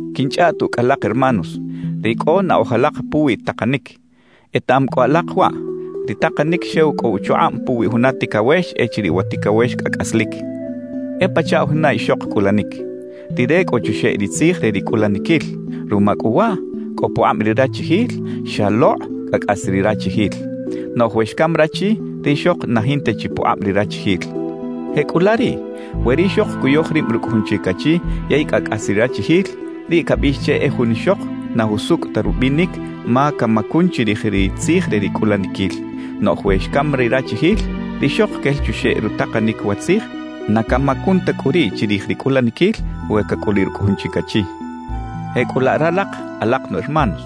Quinchꞌaꞌt ucꞌ alak hermanos, ri cꞌo naꞌoj alak puwi takanic. Etaꞌam cꞌu alak waꞌ: Ri takanic xew cꞌo uchukꞌab puwi juna ticawex echiriꞌ wa ticawex cꞌa cꞌaslic. E pachaꞌ juna ixok cꞌulanic. Rire cꞌo chuxeꞌ ri tzij re ri cꞌulaniquil. Ruma cꞌu waꞌ cꞌo pukꞌab ri rachijil xalokꞌ cꞌa cꞌas ri rachijil. Noꞌj we xcam rachi, rixok na jinta chi pukꞌab ri rachijil. Jecꞌulaꞌ riꞌ, we rixok cuyoj rib rucꞌ jun chic achi yey cꞌa cꞌas ri rachijil, riꞌ cabiꞌx che e jun ixok na jusucꞌ ta rubinic ma camacun chirij ri tzij re ri cꞌulaniquil. Noꞌj we xcam ri rachijil, rixok quel chuxeꞌ rutakanic wa tzij; na camacun ta cꞌu riꞌ chirij ri cꞌulaniquil we cacꞌuliꞌ rucꞌ jun chic achi. Jecꞌulaꞌ ralak alak nu hermanos,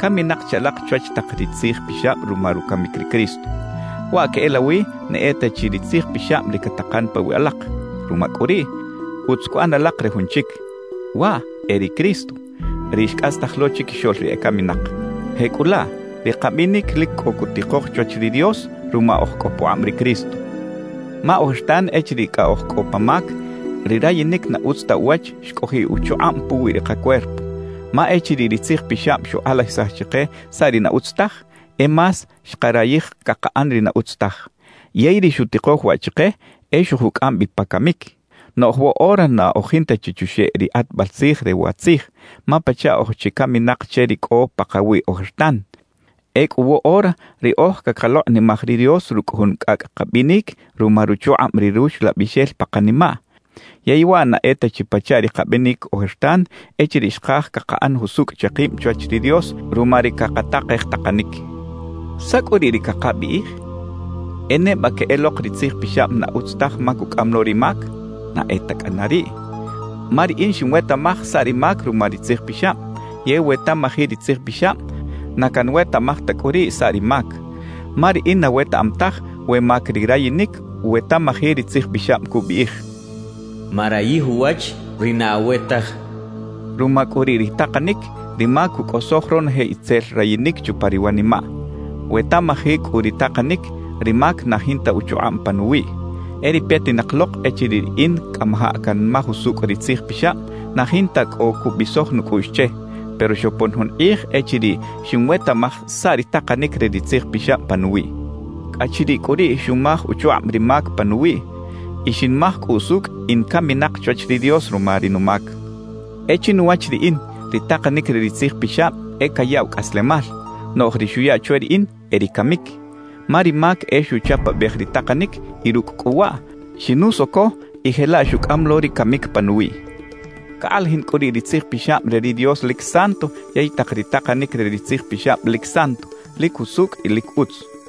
caminak chi alak chwach tak ri Tzij Pixab ruma rucamic ri Cristo. Waꞌ queꞌelawi na e ta chi ri Tzij Pixab ri catakan pawiꞌ alak. Ruma cꞌu riꞌ, utz cuꞌan alak re jun chic, waꞌ e ri Cristo, ri xcꞌastaj lo chiquixoꞌl ri ecaminak. Jecꞌulaꞌ ri kabinic lic cꞌo cutikoj chwach ri Dios ruma oj cꞌo pukꞌab ri Cristo. Ma ojertan echiriꞌ cꞌa oj cꞌo pa mac, ri rayinic na utz ta uwach xcꞌojiꞌ uchukꞌab puwi ri kacuerpo. Ma echiriꞌ ri Tzij Pixab xukꞌalajisaj chike saꞌ ri na utz taj, e más xkarayij cakaꞌan ri na utz taj. Yey ri xutikoj waꞌ chike e xojucꞌam bi pa camic. Noꞌj woꞌora na oj jinta chi chuxeꞌ ri kꞌatbal tzij re wa tzij, ma pachaꞌ oj chi caminak che ri cꞌo pakawiꞌ ojertan. Ecꞌu woꞌora riꞌoj cakalokꞌnimaj ri Dios rucꞌ jun cꞌacꞌ kabinic ruma ruchukꞌab ri Ruxlabixel pa kanimaꞌ, yey waꞌ na e ta chi pachaꞌ ri kabinic ojertan echiriꞌ xkaj cakaꞌan jusucꞌ che kib chwach ri Dios ruma ri cakatakej takanic. ¿Saꞌ cꞌu riꞌ ri cakabiꞌij? ¿E neba queꞌelok ri Tzij Pixab na utz taj ma cucꞌam lo ri mac? ¡Na e ta cꞌana riꞌ! Ma riꞌin xinwetaꞌmaj saꞌ ri mac ruma ri Tzij Pixab; yey we tamaji ri Tzij Pixab, na canwetaꞌmaj ta cꞌu riꞌ saꞌ ri mac. Ma riꞌin na wetaꞌam taj we mac ri rayinic we tamaji ri Tzij Pixab cubiꞌij: «Marayij uwach ri na awe taj.» Ruma cꞌu riꞌ ri takanic, ri mac cucꞌosoj ronoje itzel rayinic chupa ri wanimaꞌ. We tamaji cꞌu ri takanic, ri mac na jinta uchukꞌab panuwiꞌ. E ri petinak lok echiriꞌ riꞌin cꞌamajaꞌ canmaj usucꞌ ri Tzij Pixab, na jinta cꞌo cubisoj nucꞌuꞌx che. Pero xopon jun kꞌij echiriꞌ xinwetaꞌmaj saꞌ ri takanic re ri Tzij Pixab panuwiꞌ. Cꞌa chiriꞌ cꞌu riꞌ xumaj uchukꞌab ri mac panuwiꞌ; y xinmaj cꞌu usucꞌ in caminak chwach ri Dios ruma ri numac. E chinuwach riꞌin, ri takanic re ri Tzij Pixab e cayaꞌw cꞌaslemal; noꞌj ri xuya chwe riꞌin, e ri camic. Ma ri mac e xuchapabej ri takanic y rucꞌ cꞌu waꞌ, xinusoco y jelaꞌ xucꞌam lo ri camic panuwiꞌ. Cakꞌalajin cꞌu riꞌ ri Tzij Pixab re ri Dios lic santo yey tak ri takanic re ri Tzij Pixab lic santo, lic jusucꞌ y lic utz.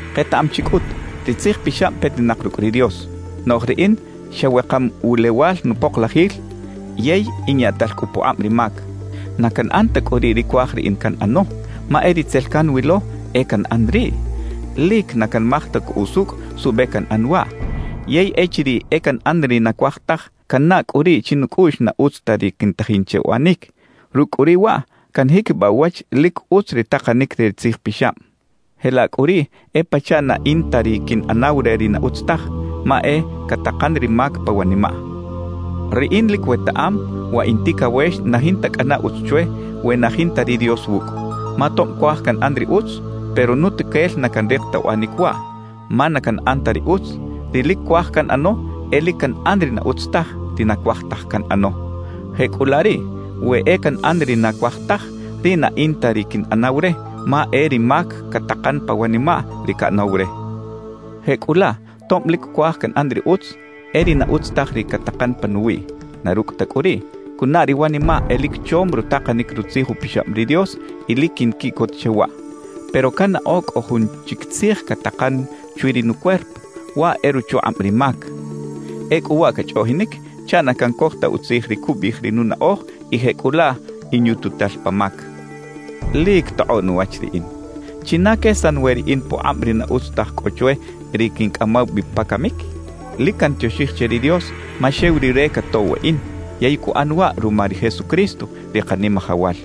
Ketaꞌam chi cꞌut, ri Tzij Pixab petinak rucꞌ ri Dios. Noꞌj riꞌin xa wekam wulewal nupoklajil, yey in yaꞌtal cꞌu pukꞌab ri mac. Na canꞌan ta cꞌu riꞌ ri cuaj riꞌin canꞌano; ma e ri tzel canwilo, e canꞌan riꞌ. Lic na canmaj ta cꞌu usucꞌ suꞌbe canꞌan waꞌ. Yey echiriꞌ e canꞌan ri na cuaj taj, cannaꞌ cꞌu riꞌ chinucꞌuꞌx na utz ta ri quintajin che uꞌanic. Rucꞌ cꞌu riꞌ waꞌ canjiquibaꞌ uwach lic utz ri takanic re ri Tzij Pixab. Jelaꞌ cꞌu riꞌ e pachaꞌ na in ta ri quinꞌanaw re ri na utz taj, ma e catakan ri mac pa wanimaꞌ. Riꞌin lic wetaꞌam, wa in ticawex na jinta cꞌana utz chwe we na jinta ri Dios wucꞌ. Ma tob cuaj canꞌan ri utz, pero nutuquel na canrik ta uꞌanic waꞌ. Ma na canꞌan ta ri utz, ri lic cuaj canꞌano; e lic canꞌan ri na utz taj, ri na cuaj taj canꞌano. Jecꞌulaꞌ riꞌ, we e canꞌan ri na cuaj taj, riꞌ na in ta ri quinꞌanaw re, ma e ri mac catakan pa wanimaꞌ ri caꞌanaw re. Jecꞌulaꞌ tob lic cuaj canꞌan ri utz, e ri na utz taj ri catakan panuwiꞌ. Na rucꞌ ta cꞌu riꞌ, cunaꞌ ri wanimaꞌ e lic chom rutakanic Rutzij Upixab ri Dios y lic quinquiꞌcot che waꞌ. Pero cannaꞌo cꞌo jun chic tzij catakan chwi ri nucuerpo; waꞌ e ruchukꞌab ri mac. Ecꞌu waꞌ cachꞌoꞌjinic chaꞌ na cancoj ta utzij ri cubiꞌij ri nunaꞌoj y jecꞌulaꞌ inyututal pa mac. ¡Lic tokꞌoꞌ nuwach riꞌin! ¿China quesan we riꞌin pukꞌab ri na utz taj cꞌo chwe, ri quincꞌamaw bi pa camic? Lic cantioxij che ri Dios, ma xew Rire catoꞌw weꞌin, yey cuꞌan waꞌ ruma ri Jesucristo, ri Kanimajawal.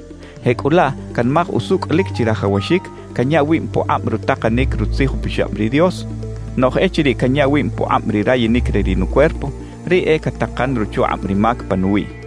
Jecꞌulaꞌ canmaj usucꞌ lic chirajawaxic canya wib pukꞌab rutakanic Rutzij Upixab ri Dios; noꞌj echiriꞌ canya wib pukꞌab ri rayinic re ri nucuerpo, riꞌ e catakan ruchukꞌab ri mac panuwiꞌ.